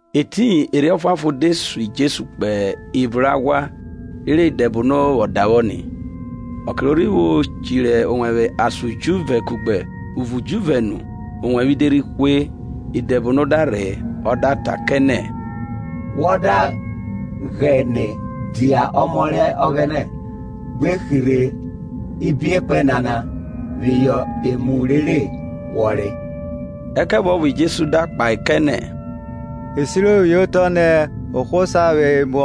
Etiyin Erhi Ọfuanfon de sun Jesu kpo evun rẹ aghwa rere idẹbono vwọ davwọ ni. Ọke ro rhi vwo chiri owẹvwe ason ujuvẹ kugbe uvo ujuvẹ nu owẹvwe de rhi hwe. Idebono da rhe ọ da ta kẹ nẹ, Wọ da ghene dia ọmọ rẹ Ọghẹnẹ, gbe hirhe ibiekpẹn nana phihọ emu rere wọ re. Ẹkẹvuọvo Jesu da kpahe kẹ nẹ, e siro phihọ otọ nẹ, ohwo sa vwẹ emu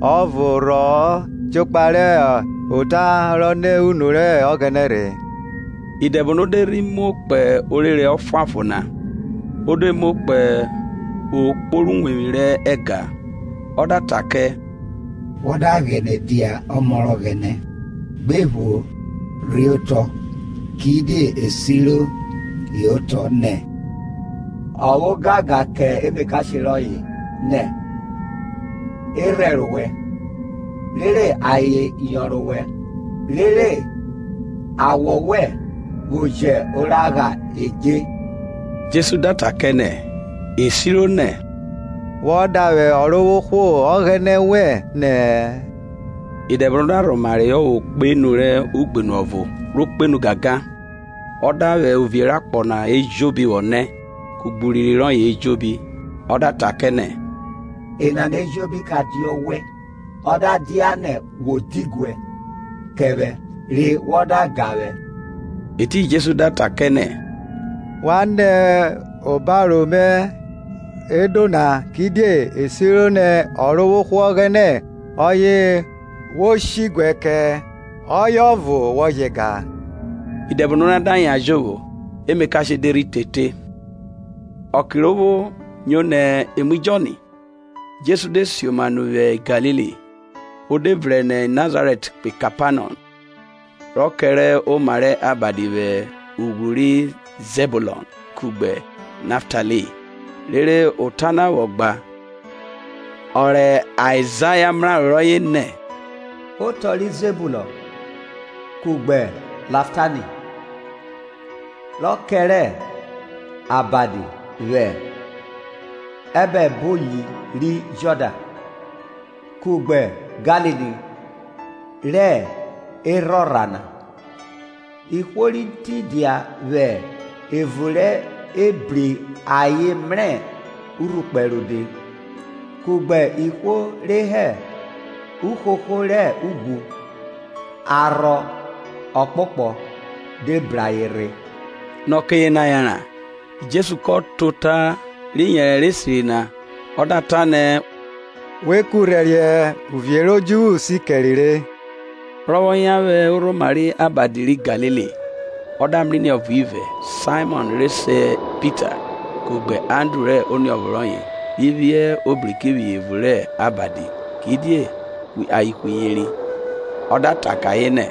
ọvo rhọ-ọ, jokpa rẹ ota ro nẹ unu rẹ Ọghẹnẹ rhe. Idẹbono de rhe muo kpo orere ọfuanfon na; o de muo kpo okpo rẹ uwevwi rẹ ẹga, Ọ da ta kẹ, Wọ da ghene dia ọmọ rẹ Ọghẹnẹ, gbe pho rhe otọ; kidie e siro hẹ otọ nẹ, Ọ vwẹ ogangan kẹ emakashe rọye nẹ, E rhẹrẹ owẹ. Rere ayen yonrọn owẹ, rere awọ wẹn vwo jẹ oragha edje. Jesu da ta kẹ nẹ, e siro nẹ, Wọ davwẹ Ọrovwohwo Ọghẹnẹ wẹn nẹ-ẹ. Idẹbono da rhoma reyọ vwo kpo enu rẹ ugbenu ọvo ro kpenu gangan, ọ da vwẹ uvie rẹ akpọ na ejobi vwọ nẹ, kugbe urinrin rọye ejobi; Ọ da ta kẹ nẹ, enana ejobi ke dia ewẹ, ọ da dianẹ wo diguẹ kẹ vwẹ re wọ da ga vwẹ. Etiyin Jesu da ta kẹ nẹ, Wan nẹ obaro mẹ, Ẹdjo na; Kidie e siro nẹ, Ọrovwohwo Ọghẹnẹ ọye wo shiguẹ kẹ, ọye ọvo wo je ga. Idẹbono na da yan jovwo; emakashe de rhi tete. Ọke ro vwo nyo nẹ e mu Jọn, Jesu de sioma nu vwi Galili. O de vrẹn nẹ Nazarẹt kpo Kepanọm rọ kẹrẹ oma rẹ abadi, vwẹ ughwru ri Zẹbulọn kugbe Naftaili. Rere ota na vwọ gba, ọ rẹ Aizaya mraro rọye nẹ, Otọ ri Zẹbulọn kugbe Naftaili, Rọ kẹrẹ abadi vwẹ abo oboyi ri Jọdan, Kugbe Galili rẹ erhorha na, Ihwo ri tidia vwẹ evun rẹ ebri ayen mrẹ urhukpẹ rode, kugbe ihwo re hẹ uhoho rẹ ughwu, Arhọ ọkpokpọ de bru ayen rhe. Nẹ ọke yena yanran, Jesu kọ ta ota rẹ iyẹnrẹ esiri na, ọ da ta nẹ, we kurhẹriẹ, uvie rẹ odjuvwu si kẹre re. Rọ vwọ yan vwẹ orhoma rẹ abadi ri Galili, ọ da mrẹ iniovo ivẹ, Saimọn re se Pita, kugbe Andru rẹ oniọvo rọye ri phiẹ obriki vwẹ evun rẹ abadi, kidie ayen ihwiyeri. Ọ da ta kẹ ayen nẹ,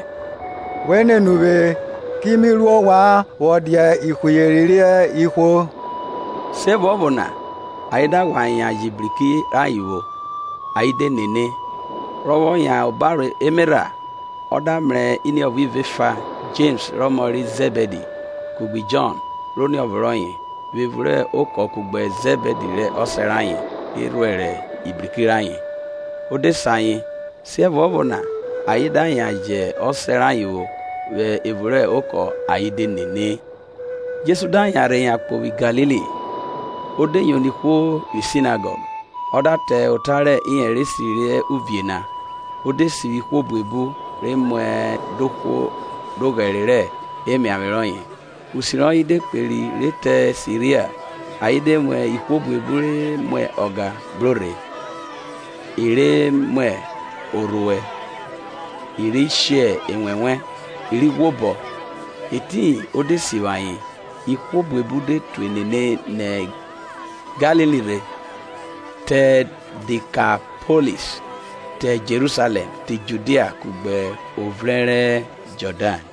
We nene uvwe, ki nu ru ovwan vwọ dia ihwiyeri rẹ ihwo. Siẹvuọvo na, ayen da ghwa yan jẹ ibriki rayen vwo, ayen de nene. Rọ vwọ yan hẹ obaro emerha, ọ da mrẹ iniọvo ivẹ efa, Jems rẹ ọmọ ri Zẹbidi kugbe Jọn rẹ oniọvo rọye, vwẹ evun rẹ okọ kugbe Zẹbidi rẹ ọsẹ rayen re rhuẹrẹ ibriki rayen, o de se ayen. Siẹvuọvo na ayen da yan jẹ ọsẹ rayen vwo vwẹ evun rẹ okọ ayen de nene. Jesu da yanrhe yankpo vwi Galili, o de yono ihwo vwi Sinagọg, ọ da ta ota rẹ iyẹnre esiri rẹ uvie na, o de sivwi ihwo buebu re mwa ọga, dohwo doghẹre rẹ emiavwe rọye. Usi rọye de kperi ruẹ Siria; ayen de mu ihwo buebu re mwa ọga bro rhe, e re mwa orhuẹ, i ri she enwẹnwẹ, i ri ghwoma; etiyin o de sivwi ayen. Ihwo buebu de tue nene nẹ Galili rhe, te Dikapolis, te Jerusalẹm, te Judia kugbe ovrẹn ri Jọdan.